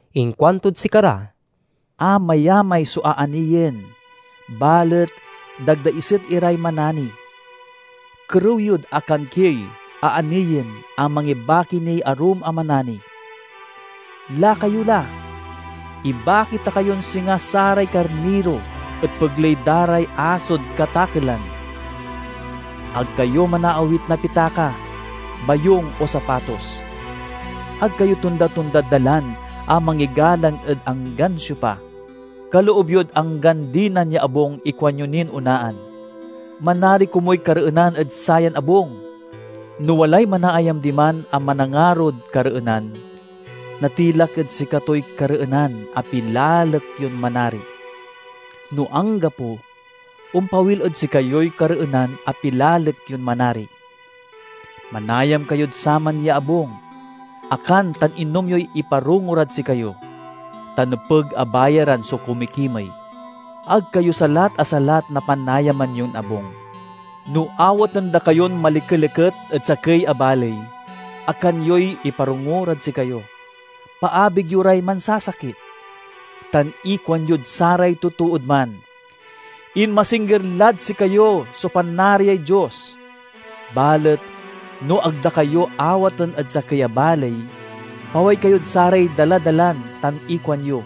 Inkuantod sikara, "Amayamay so aaniyen, balet dagdaiset iray manani. Kerew yod akankiey aaniyen a mangibaki niy arum a manani. Laka yo la! Ibaki ta kayon singa saray karniro ed pegley da ray asod katakelan. Ag kayo manaawit na pitaka, bayung, o sapatos. Ag kayo tonda-tondad dalan a mangigalang ed anggan siopa. Kaloob yod anggan dinan ya abung ikuanyo nin onaan, 'Manari komuy kareenan ed sayan abung!' No walay manaayam diman a manangarod kareenan, natilak ed sikatoy kareenan a pilalek yon manari. No anggapo, ompawil ed sikayoy kareenan a pilalek yon manari. Manayam kayod saman ya abung; akan tan inom yoy iparongo rad sikayo, ta nepeg a bayaran so kumikimey. Ag kayo salat a salat na panayaman yon abung. No awaten da kayon malikeliket ed sakey a baley, akan yoy iparongo rad sikayo, paabig yo ray mansasakit, tan ikuanyod saray totood man, 'Inmasingger lad sikayo so Panariay Dios.' Balet no ag da kayo awaten ed sakey a baley, paway kayod saray daladalan tan ikuanyo,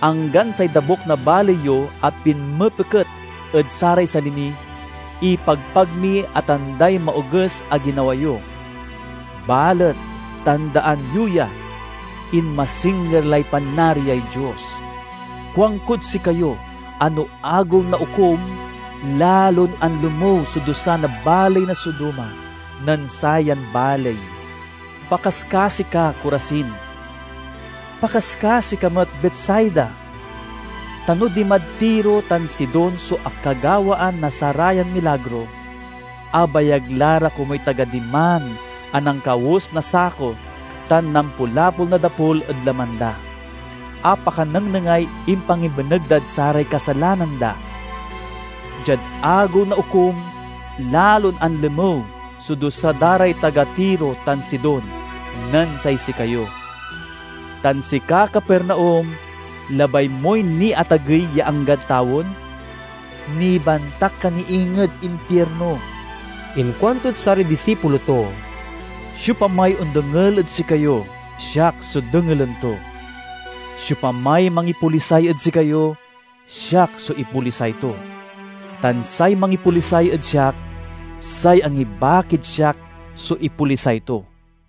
'Anggan say dabuk na baley yo a pinmepeket ed saray sali mi, ipagpag mi a tanday maoges a ginawa yo. Balet, tandaan yo ya, inmasingger lay Panariay Dios!' Kuankod sikayo a no Agew na Okum, lalon anlemew so dusa na baley na Sodoma nen sayan baley!" "Pakaskasi ka, Corazin! Pakaskasi ka met, Betsaida! Ta no dimad Tiro tan Sidon so akagawaan na sarayan milagro, abayag la ra komuy taga diman a nankawes na sako tan nampulapol na dapul ed laman da, a pakanengnengay impangibeneg dad saray kasalanan da! Diad Agew na Okum, lalon anlemew so dusa da ray taga Tiro tan Sidon nen say sikayo. Tan sika, Capernaum, labay moy niatagey ya anggad tawen? Nibantak ka ni inged impirno!" Inkuantod saray disipulo to, "Siopamay ondengel ed sikayo, siak so dengelen to. Siopamay mangipolisay ed sikayo, siak so ipolisay to; tan say mangipolisay ed siak, say angibakid siak so ipolisay to."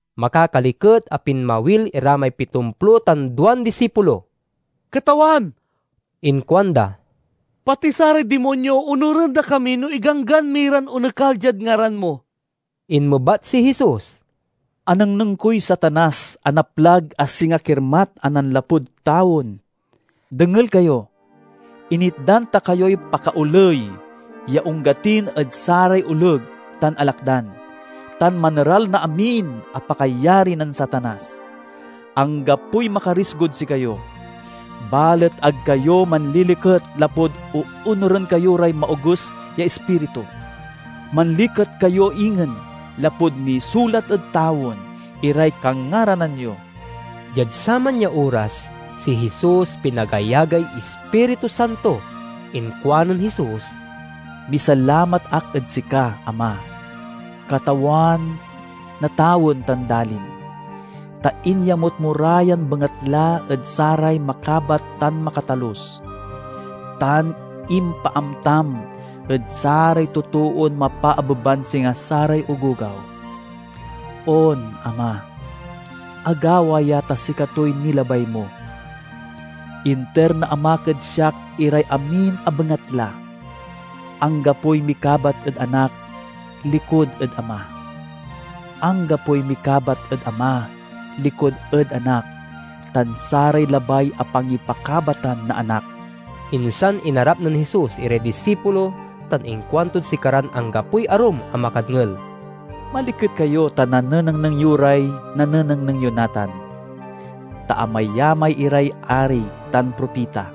Makakaliket a pinmawil ira may pitomplo tan duan disipulo. "Katawan," inkuanda, "pati saray dimonyo onuren da kami no iganggan mi ran onekal diad ngaran mo." Inmebat si Jesus, "Anengneng koy Satanas a naplag a singa kirmat a nanlapud tawen! Dengel kayo! Initdan ta kayoy pakaoley ya onggatin ed saray oleg tan alakdan, tan maneral na amin a pakayari nen Satanas. Anggapoy makarigsod sikayo. Balet ag kayo manliliket lapud oonuren kayo ray maoges ya ispiritu. Manliket kayo ingen lapud nisulat ed tawen iray kangaranan yo." Diad saman ya oras, si Jesus pinagayagay Ispiritu Santo. Inkuanen Jesus, "Misalamat ak ed sika, Ama, Katawan na tawen tan dalin, ta inyamut mo ra yan bengatla ed saray makabat tan makatalus, tan impaamtam ed saray totoon mapaabeban singa saray ogogaw. On, Ama, agawa ya ta sikatoy nilabay mo. "Inter na Amak ed siak iray amin a bengatla. Anggapoy mikabat ed Anak likud ed Ama; anggapoy mikabat ed Ama likud ed Anak tan saray labay a pangipakabatan na Anak." Insan inarap nen Jesus iray disipulo tan inkuantod sikaran anggapoy arum a makadngel, "Maliket kayo ta nanenengneng yo ray nanenengneng yo natan! Ta amayamay iray ari tan propita,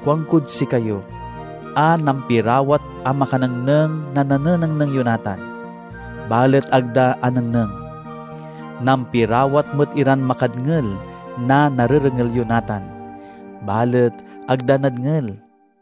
kuankod sikayo, a nampiwarat a makanengneng na nanenengneng yo natan, balet ag da anengneng. Nampirawat met iran makadngel na narerengel yo natan, balet ag da nadngel."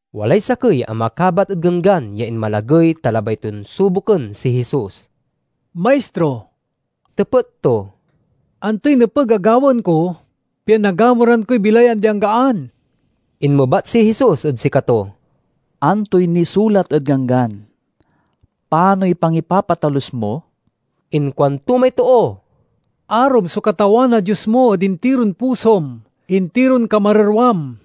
Walay sakey a makabat ed Ganggan ya inmalagey ta labay ton suboken si Jesus. "Maistro," tepet to, "antoy nepeg a gawaen ko pian nagamuran koy bilay ya andi-anggaan?" Inmebat si Jesus ed sikato, "Antoy nisulat ed Ganggan? Panoy pangipapatalus mo?" Inkuanto may too, " 'Arom so Katawan a Dios mo ed intiron pusom, intiron kamererwam,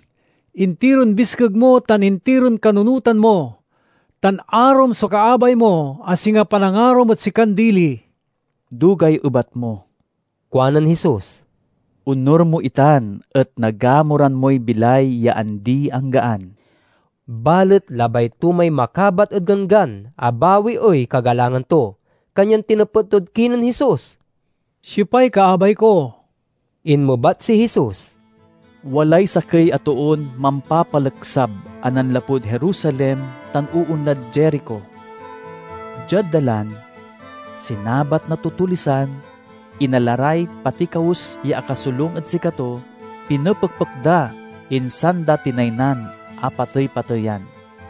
intiron biskeg mo, tan intiron kanunotan mo'; tan, 'Arom so kaabay mo a singa panangarom ed sikan dili.'" "Dugay ebat mo," kuanen Jesus. "Onur mo itan et nagamuran moy bilay ya andi-anggaan." Balet labay to may makabat ed Ganggan a bawiey kagalangan to, kanyan tinepet tod kinen Jesus, "Siopay kaabay ko?" Inmebat si Jesus, "Walay sakey a toon mampapaleksab a nanlapud Jerusalem tan oonlad Jerico. Diad dalan, sinabat na tutulisan, inala ray pati kawes ya akasolung ed sikato, pinepekpek da, insan da tinaynan a patey-pateyan.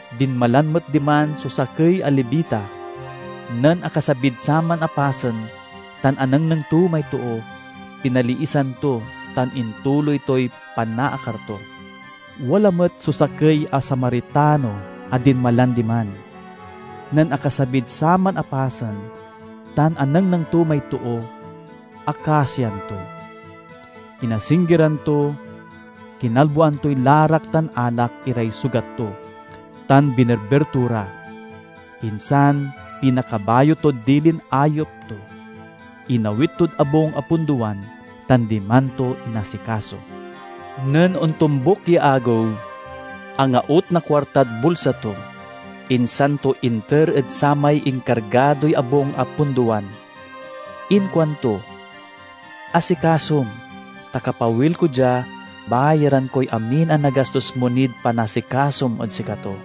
Dinmalan met diman so sakey a Levita. Nen akasabid saman a pasen tan anengneng to may too, pinaliisan to tan intuloy toy panaakar to. Wala met so sakey a Samaritano a dinmalan diman. Nen akasabid saman a pasen tan anengneng to may too, akasian to. Inasinggeran to, kinalboan toy larak tan alak iray sugat to, tan binerber to ra. Insan pinakabayo tod dilin ayep to; inawit tod abung a pundowan, tan diman to inasikaso. Nen ontombuk ya agew, angaut na kuartad bulsa to, insan to inter ed samay inkargadoy abung a pundowan. Inkuanto, 'Asikasom, ta kapawil ko dia, bayaran koy amin a nagastos mo nid panasikasom ed sikato.'"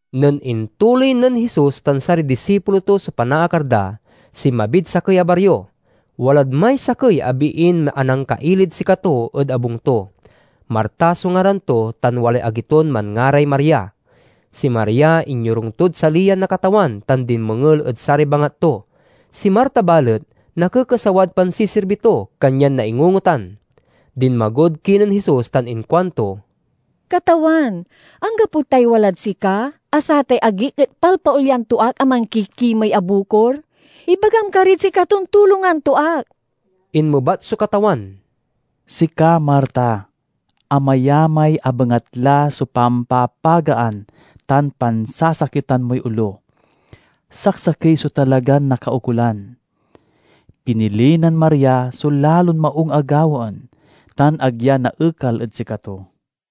Nen intuloy nen Jesus tan saray disipulo to so panaakar da, sinmabid sakey a bario. Walad may sakey a biin anangkailid sikato ed abung to. Marta so ngaran to, tan walay agi ton manngaray Maria. Si Maria inyorung tod saliyan na Katawan tan dinmengel ed saray bangat to. Si Marta, balet, nakekesawad pansisirbi to, kanyan naingungotan. Dinmagod kinen Jesus tan inkuanto, "Katawan, anggapo tay walad sika, a satay agik et palpaolyan to ak a mankikimey a bukor? Ibagam karid sikaton tulongan to ak!" Inmebat so Katawan, "Sika, Marta, amayamay a bengatla so pampapagaan tan pansasakitan moy olo. Saksakey so talagan nakaukolan! Pinili nen Maria so lalon maung a gawaen, tan ag ya naekal ed sikato."